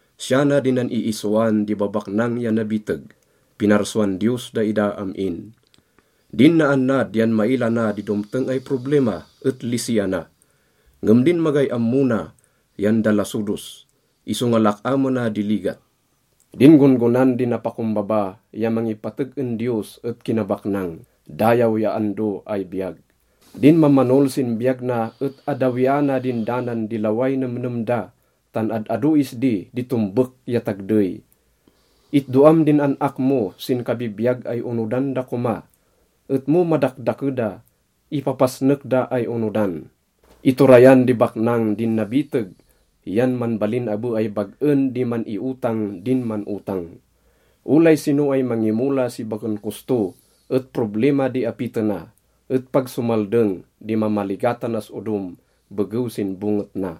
Siya na di nan-iisoan di babaknang ya nabiteg: pinarsuan Diyos daida am-in. Din naannad yan maila na di domteng ay problima et lisiana, ngem din magay ammo na yan dalasodos, isonga lak-amena di ligat. Din gon-gonan di napakombaba ya mangipateg en Diyos et kinabaknang, dayaw ya ando ay biyag. Din mamanol sin biyag na et addawiana din danan di laway nemnem da, tan ad-ado isdi di tombek ya tagdey. Itdoam din an-ak mo sin kabibiyag ay onodan da koma, et mo madakdake da, ipapasnek da ay onodan. Iturayan di baknang din nabiteg yan manbalin abe ay bag-en di man-iotang din man-otang. Olay sino ay mangimola si baken kosto et problima di apitena, et pag somaldeng di mamaligatanas odom begew sin bonget na.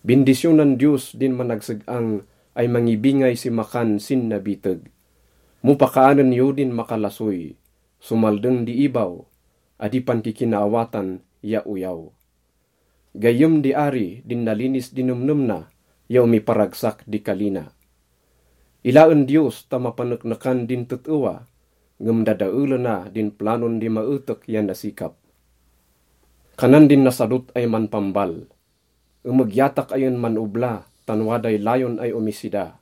Bindisyonan Diyos din managseg-ang ay mangibingay si makan sin nabiteg. Mo pakaanen yo din makalasoy, somaldeng di ibaw, adi pankikinaawatan, ya oyaw. Gayyem di ari din nalinis di nemnem na ya omiparagsak di kali na. Ilaen Diyos ta mapaneknekan din tet-ewa, ngem dadaelena din planon di maetek ya nasikap. Kanan din nasadot ay manpambal, “Emegyatak ay en man-obla tan waday layon ay omisida.”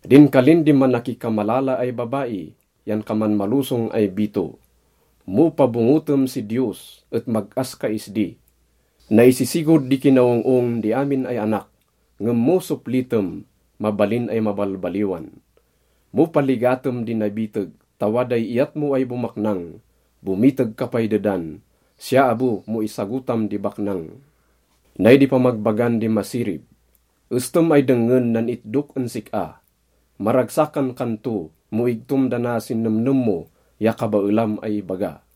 Din kalin di manakikamalala ay babai yan kaman malosong ay bito. Mo pabongetem si Diyos et mag-as ka isdi. Naisisigod di kinaong-ong di amin ay anak, ngem no soplitem, mabalin ay mabalbaliwan. Mo paligatem di nabiteg ta waday iyat mo ay bomaknang, bomiteg ka pay dedan. Siya abe mo isagotam di baknang. Nay di pamagbagan di masirib. Estem ay dengngen nan itdok en sik-a. Maragsakan kan to mo igtom dana sin nemnem mo ya kabaelam ay ibaga.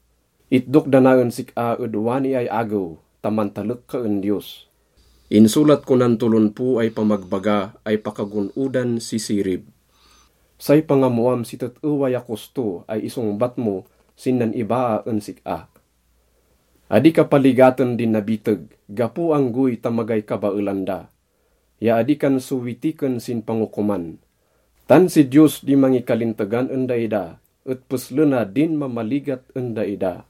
Itdok dana en sik-a ed wani ay agew ta mantalek ka en Diyos. Insolat ko nan tolonpo ay pamagbaga ay pakagon-odan si sirib. Say pangammoam si tet-ewa ya kosto ay isongbat mo sin nan-ibaa en sik-a. Adi ka paligaten di nabiteg gapo anggoy ta magay kabaelan da, ya adi kan sowitiken sin pangokoman, tan si Diyos di mangikalintegan en daida et peslena din mamaligat en daida.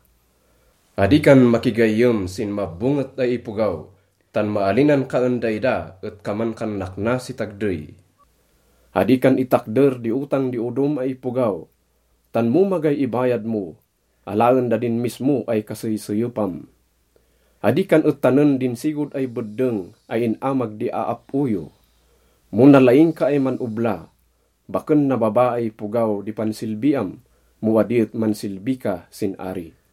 Adi kan makigayyem sin mabonget ay ipogaw, tan maalinan ka en daida et kaman kan nakna si tagdey. Adi kan itakder di otang di odom ay ipogaw, tan mo magay ibayad mo, alaen da din mismo ay kaseyseyepam. Adi kan etanen din sigod ay beddeng ay in-amag di aap-o yo. Mo nalaing ka ay man-obla, baken nababa ay ipogaw di pansilbiam mo adi et mansilbi ka sin ari.